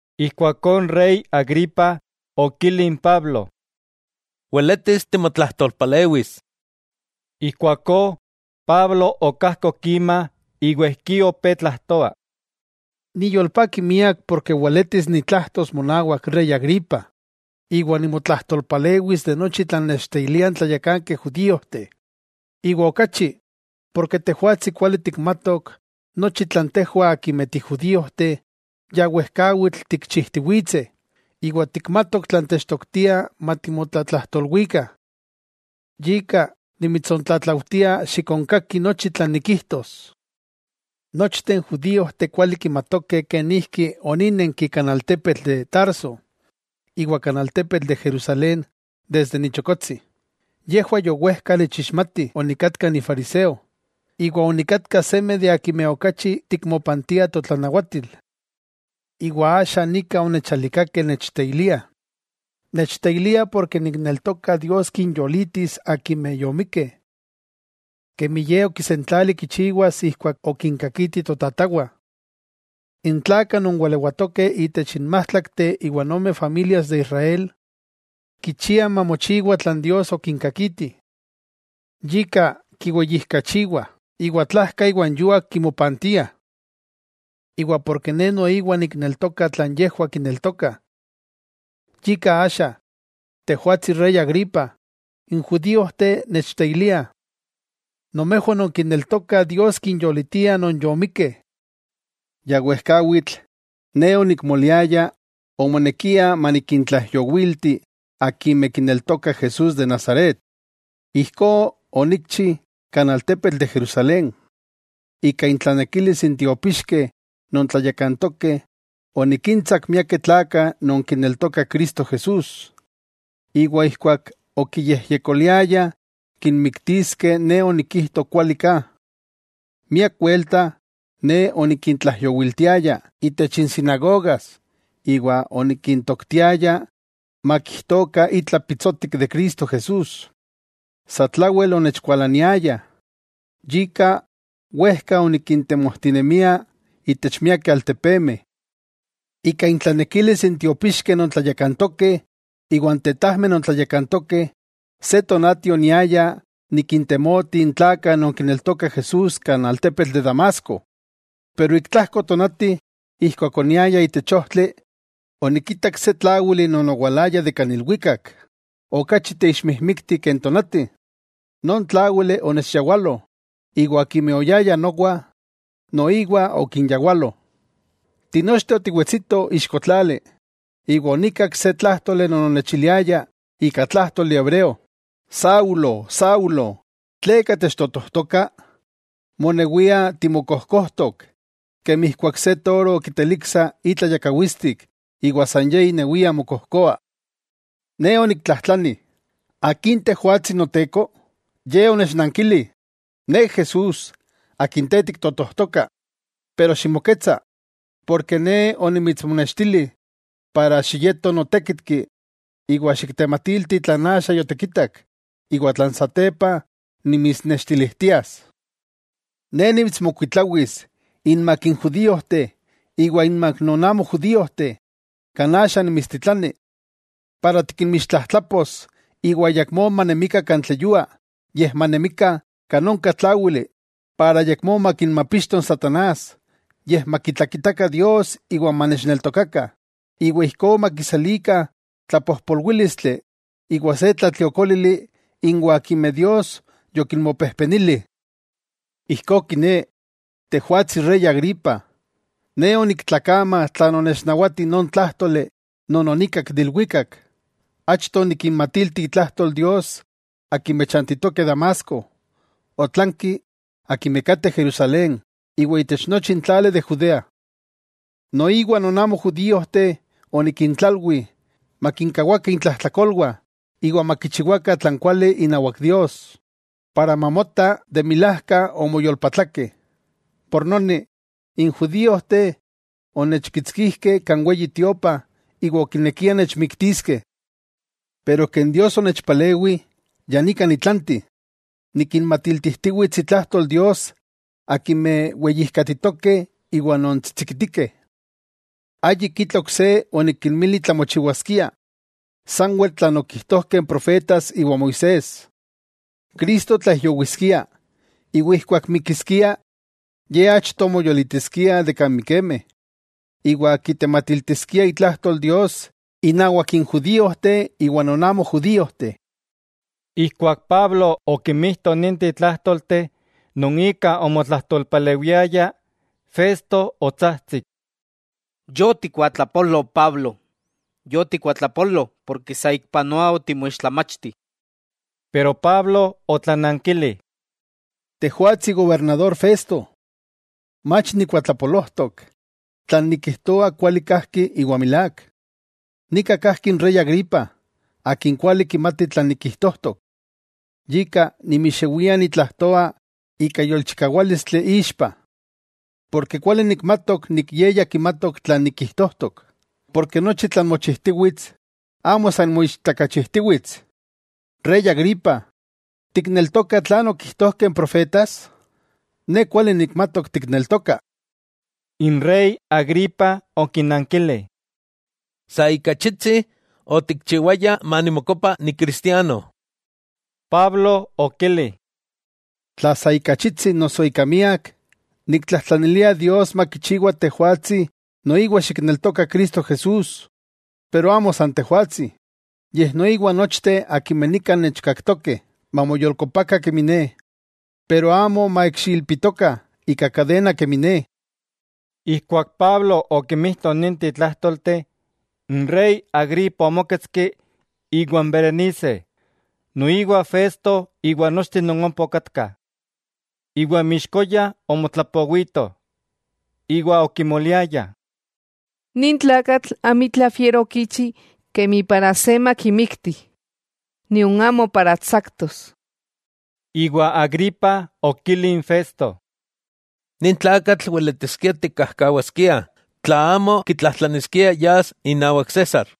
Ijkuakó n rey Agripa okili n Pablo: —Weletis timotlajtolpalewis. Ijkuakó Pablo okajkok ima iwa ijkí opé tlajtoa: —Niyolpaki miak porke weletis nitlajtos monawak rey Agripa, iwa nimotlajtolpalewis de nochi tlan nechteiliah n tlayakankeh judíojteh. Iwa okachi, porke tejwatsi kuali tikmatok nochi tlan tejwah akimeh tijudíojteh ya wejkawitl tikchijtiwitseh, iwa tikmatok tlan techtoktia matimotlatlajtolwikah. Yika nimitsontlatlaujtia xikonkaki nochi tlan nikijtos. 'Nochteh n judíojteh kuali kimatokeh kenijki oninenki kan altepetl de Tarso iwa kan altepetl de Jerusalén desde ni chokotsi. Yejwah yowejka nechixmatih onikatka nifariseo, iwa onikatka seme de akimeh okachi tikmopantiah totlanawatil. Iwa axa nika onechalikakeh nechteiliah. Nechteiliah porke nikneltoka Dios kinyolitis akimeh yomikkeh, kemi Ye okisentlali kichiwas ijkuak okinkakiti totatawah. N tlakah non walewatokeh itech n májtlakteh iwa ome familias de Israel kichiah mamochiwa tlan Dios okinkakiti, yika kiweyijkachiwah iwa tlajka iwa n yuak kimopantiah. Iwa porke ne noiwa nikneltoka tlan yejwah kineltokah, yika axa, tejwatsi rey Agripa, n judíojteh nechteiliah. Nomejwah nonkineltokah Dios kinyolitia non yomikkeh. 'Ya wejkawitl, ne onikmoliaya omonekia manikintlaijyowilti akimeh kineltokah Jesús de Nazaret. Ijkó onikchi kan altepetl de Jerusalén. Ika intlanekilis n tiopixkeh non tlayakantokeh onikintsak miakeh tlakah non kineltokah Cristo Jesús. Iwa ijkuak okiyejyekoliayah kinmiktiskeh ne onikijto kuali ka. Miak welta ne onikintlaijyowiltiaya itech n sinagogas iwa onikintoktiaya makijtokah itla pitsotik de Cristo Jesús. Satlawel onechkualaniayah, yika wejka onikintemojtinemia itech miakeh altepemeh. 'Ika intlanekilis n tiopixkeh non tlayakantokeh iwa n tetajmeh non tlayakantokeh, se tonati oniaya nikintemoti n tlakah non kineltokah Jesús kan altepetl de Damasco. Pero ik tlajko tonati, ijkuak oniaya itech ojtli onikitak se tláwili non owalaya de kan ilwikak okachi teixmijmikti ke n tonati. Non tláwili onechyawalo, iwa akimeh oyayah nowa noiwa okinyawalo. Tinochteh otiwewetsitoh ixko tlali, iwa onikak se tlájtoli non onechiliaya ika tlájtoli hebreo: “Saulo, Saulo, ¿tleka techtotojtoka? Monewia timokojkojtok, kemi ijkuak se toro kiteliksa itla yakawitstik iwa san ye inewia mokojkoa.” Ne oniktlajtlani: “¿Akin tejwatsi Noteko?” Ye onechnankili: “Ne Jesús, akin te tiktotojtoka. Pero ximoketsa, porke ne onimitsmonextili para xiyeto notékitki iwa xiktematilti tlan axa yotikitak iwa tlan satepa nimitsnextilijtias. Ne nimitsmokuitlawis inmak n judíojteh iwa inmak non amo judíojteh, kan axa nimitstitlani para tikinmixtlajtlapos iwa ayakmó manemikah kan tlatleyua yej manemikah kan onka tláwili para ayakmó makinmapixto n satanás, yej makitlakitakah Dios; iwa manechneltokakah, iwa ijkó makiselikah tlapojpolwílistli iwa se tlatliokólili inwah akimeh Dios yokinmopejpenili.” 'Ijkó kiné, tejwatsi rey Agripa, ne oniktlakama tlan onechnawati non tlájtoli non onikak de ilwikak. Achto onikinmatilti itlajtol Dios akimeh chantitokeh Damasco, otlanki akimeh kateh Jerusalén iwa itech nochi n tlali de Judea. Noiwa non amo judíojteh onikintlalwi makinkawakah intlajtlakolwah iwa makichiwakah tlan kuali inawak Dios, para mamota de milajka omoyolpatlakeh. Yika, n judíojteh onechkitskijkeh kan Weyi Tiopa iwa okinekiah nechmiktiskeh. Pero ken Dios onechpalewi ya nika nitlanti, nikinmatiltijtiwits itlajtol Dios akimeh weyijkatitokeh iwa non tsitsikitikeh. Ayik itla oksé onikinmili tlamochiwaskia, sanwel tlan okijtojkeh n profetas iwa Moisés, Cristo tlaijyowiskia, iwa ijkuak mikiskia, Ye achto moyolitiskia de kan mikemeh, iwa kitematiltiskia itlajtol Dios innawak n judíojteh iwa non amo judíojteh. Ijkuak Pablo okimijto ninteh tlájtolteh non ika omotlajtolpalewiaya, Festo otsajtsik: —¡Yotikuatlapolo, Pablo! Yotikuatlapolo porke saikpanoa otimoixtlamachti. Pero Pablo otlanankili: —Tejwatsi gobernador Festo, mach nikuatlapolojtok. Tlan nikijtoa kuali kajki iwa milák. Nika kajki n rey Agripa, akin kuali kimati tlan nikijtojtok, yika nimixewia nitlajtoa ika yolchikawálistli ixpa, ken kuali nikmatok ye ya kimatok tlan nikijtojtok, porke nochi tlan mochijtiwits, amo san moichtakachijtiwits. Rey Agripa, ¿tikneltoka tlan okijtojkeh n profetas? Ne kuali nikmatok tikneltoka. N rey Agripa okinankili: —Sa ika achitsi otikchiwaya manimokopa nicristiano. Pablo okili: —Tla sa ika achitsi noso ika miak, niktlajtlanilia Dios makichiwa tejwatsi noiwa xikneltoka Cristo Jesús. Pero amo san tejwatsi, yej noiwa nochteh akimeh nika nechkaktokeh, mamoyolkopakah kemi ne. Pero amo maikxiilpitokah ika kadena kemi ne. Ijkuak Pablo okimijto ninteh tlájtolteh, n rey Agripa omóketski iwan Berenice, noiwa Festo iwa nochteh non ompa okatkah, iwa inmixkoya omotlapowitoh. Iwa okimoliayah: —Nin tlakatl amitla fiero okichi kemi para se makimikti, nion amo para tsaktos. Iwa Agripa okili n Festo: —Nin tlakatl weletiskia tikkajkawaskiah, tla amo kitlajtlaniskia yas inawak César.